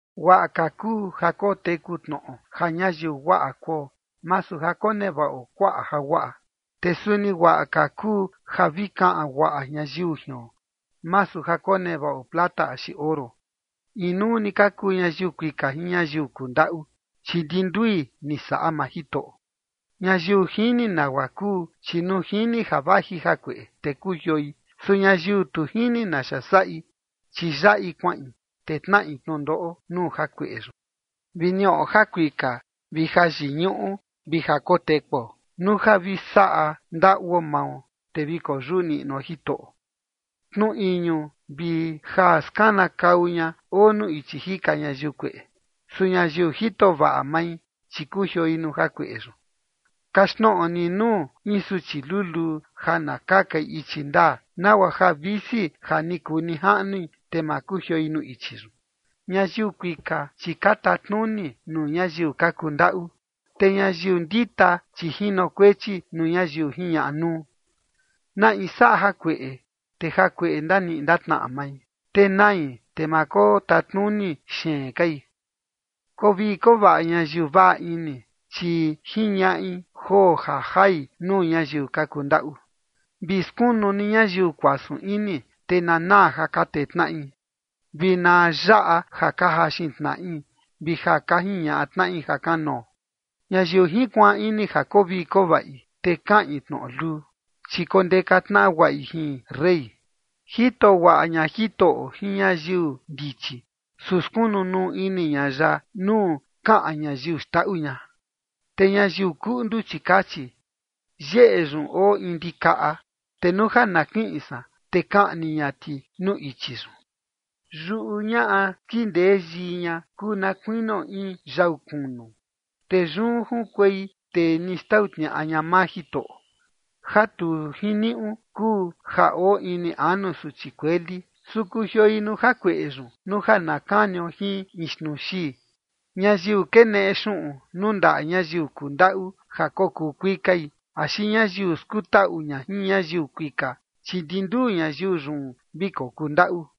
Guaꞌa ka kuu ja koteku tnoꞌo ja ñayiu guaꞌa kuo, masu ja konevaꞌo kuaꞌa jaguaꞌa. Te suni guaꞌa ka kuu ja vi kaꞌan guaꞌa ñayiu jion, masu ja konevaꞌo plata axi oro. Inuu ni ka kuu ñayiu kuika jin ñayiu kundaꞌu, chi ndi ndui ni saꞌa maa Jitoꞌo. Ñayiu jini nagua kuu, chi nuu jini ja vaji jakueꞌe, te kujioi. Su ñayiu tu jini naxa saꞌi, chi yaꞌi kuaꞌin, te tnaꞌi tnundoꞌo nuu jakueꞌe yun. Vi niꞌo jakuika vi jayiñuꞌu vi jakotekuo, nuu ja vi saꞌa ndaꞌuo mao, te vi koyuꞌu niꞌnuo Jitoꞌo. Tnu iñu vi ja skanakau ña oo nuu ichi jika ñayiu kueꞌe. Su ñayiu jito vaꞌa mai, chi kujioi nuu jakueꞌe yun. Kaxtnoꞌo ni nuu in suchi luluu ja na kakai ichi ndaa, nagua ja visi ja ni kuu nijaꞌnui, te ma kujioi nuu ichi yun. Ñayiu kuika, chi ka tatnuni nuu ñayiu ka kundaꞌu, te ñayiu ndita, chi jinokuechi nuu ñayiu jiñaꞌa nuu. Na in saꞌa jakueꞌe, te jakueꞌe ndaniꞌi ndatnaꞌa mai, te nai, te ma kotatnuni xeen kai. Koo vii koo vaꞌa ñayiu vaꞌa ini, chi jiñaꞌi joo ja jai nuu ñayiu ka kundaꞌu. Vi skunu ni ñayiu kuasun ini, te na naa ja ka tee tnaꞌi, vi na yaꞌa ja ka jaxin tnaꞌi vi ja ka jiñaꞌa tnaꞌi jakanoo. Ñayiu jinkuaan ini ja koo vii koo vaꞌi, te kaꞌin tnoꞌo luu, chi kondeka tnaꞌa guaꞌi jin rey. Jito guaꞌa ña Jitoꞌo jin ñayiu ndichi. Su skunu nuu ini ña ya nuu kaꞌan ñayiu xndaꞌu ña. Te ñayiu kuꞌndu, chi kachi: “Yeꞌe yun oo in ndikaꞌa, te nuu ja na kiꞌin san, te kaꞌni ña ti nuu ichi yun”. Yuꞌu ñaꞌa skindee yii ña kuu na kuinio in yau kunu, te yun junkuei tee ni xtau tniaꞌa ña maa Jitoꞌo. Ja tu jiniuꞌu kuu ja oo ini anu suchi kueli. Su kujioi nuu jakueꞌe yun nuu ja na kanio jin in xnuu xii. Ñayiu keneꞌe xuꞌun nuu ndaꞌa ñayiu kundaꞌu ja kokuu kuikai, axi ñayiu skutaꞌu ña jin ñayiu kuika, chi ndi nduu ñayiu yun vi kokuu ndaꞌu.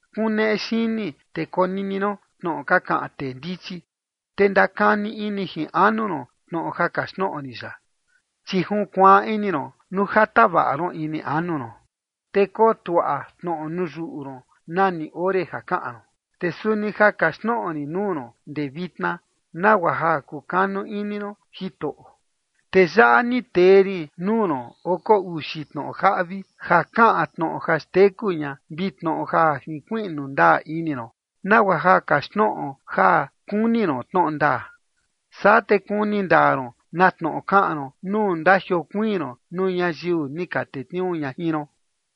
Kuneꞌe xini te konini ron tnoꞌo ka kaꞌan tee ndichi, te ndakani ini jin anu ron tnoꞌo ja kaxtnoꞌo rin yaꞌa. Chi junkuaan ini ron nuu ja tavaꞌa ron ini anu ron, te kotuaꞌa tnoꞌo nuu yuꞌu ron nani ore ja kaꞌan ron. Te suni ja kaxtnoꞌo rin nuu ron ndee vitna, nagua ja kukanu ini ron Jitoꞌo. Te yaꞌa ni tee rin nuu ron oko uxi tnoꞌo jaꞌvi ja kaꞌan tnoꞌo ja xteku ña vi tnoꞌo ja jinkuiꞌnu ndaa ini ron, nagua ja kaxtnoꞌo ja kuni ron tnoꞌo ndaa, saa te kuni ndaa ron na tnoꞌo kaꞌan ron nuu ndajiokuiin ron nuu ñayiu ni ka tetniuu ña jin ron.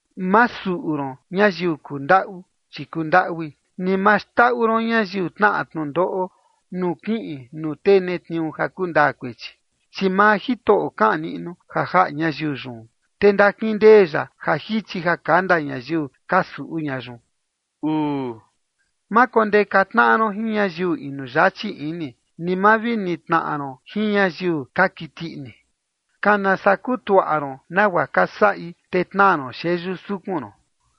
Ma suꞌu ron ñayiu kundaꞌu, chi kundaꞌui, ni ma xndaꞌu ron ñayiu tnaꞌa tnundoꞌo nuu kiꞌin nuu tee netniuu ja kundaa kuechi. Chi maa Jitoꞌo kaꞌan niꞌnu ja jaꞌa ñayiu yun te ndakindee ya ja jichi ja kanda ñayiu ka suꞌu ña yun. Ma kondeka tnaꞌa ron jin ñayiu inu yachi ini, ni ma vi nitnaꞌa ron jin ñayiu ka kiti ini. Kana saa kutuaꞌa ron nagua ka saꞌi, te tnaa ron xeyu sukun ron.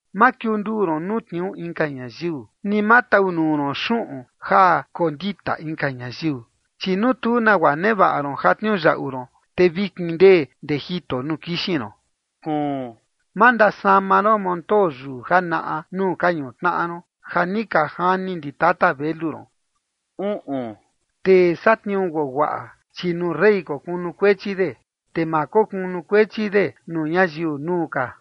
Ma kiunduu ron nuu tniuu inka ñayiu, ni ma tau nuu ron xuꞌun ja kondita inka ñayiu. Chi nuu tu nagua nevaꞌa ron ja tniuyaꞌu ron, te vi kindee ndee jito nuu kixin ron. Ma ndasama ron montoo yuu janaꞌa nuu ka ñutnaꞌa ron ja ni ka jani ndi tata velu ron. Tee satniuu guaguaꞌa, chi nuu rey kokunukuechi de, te ma kokunukuechi de nuu ñayiu nuu ka.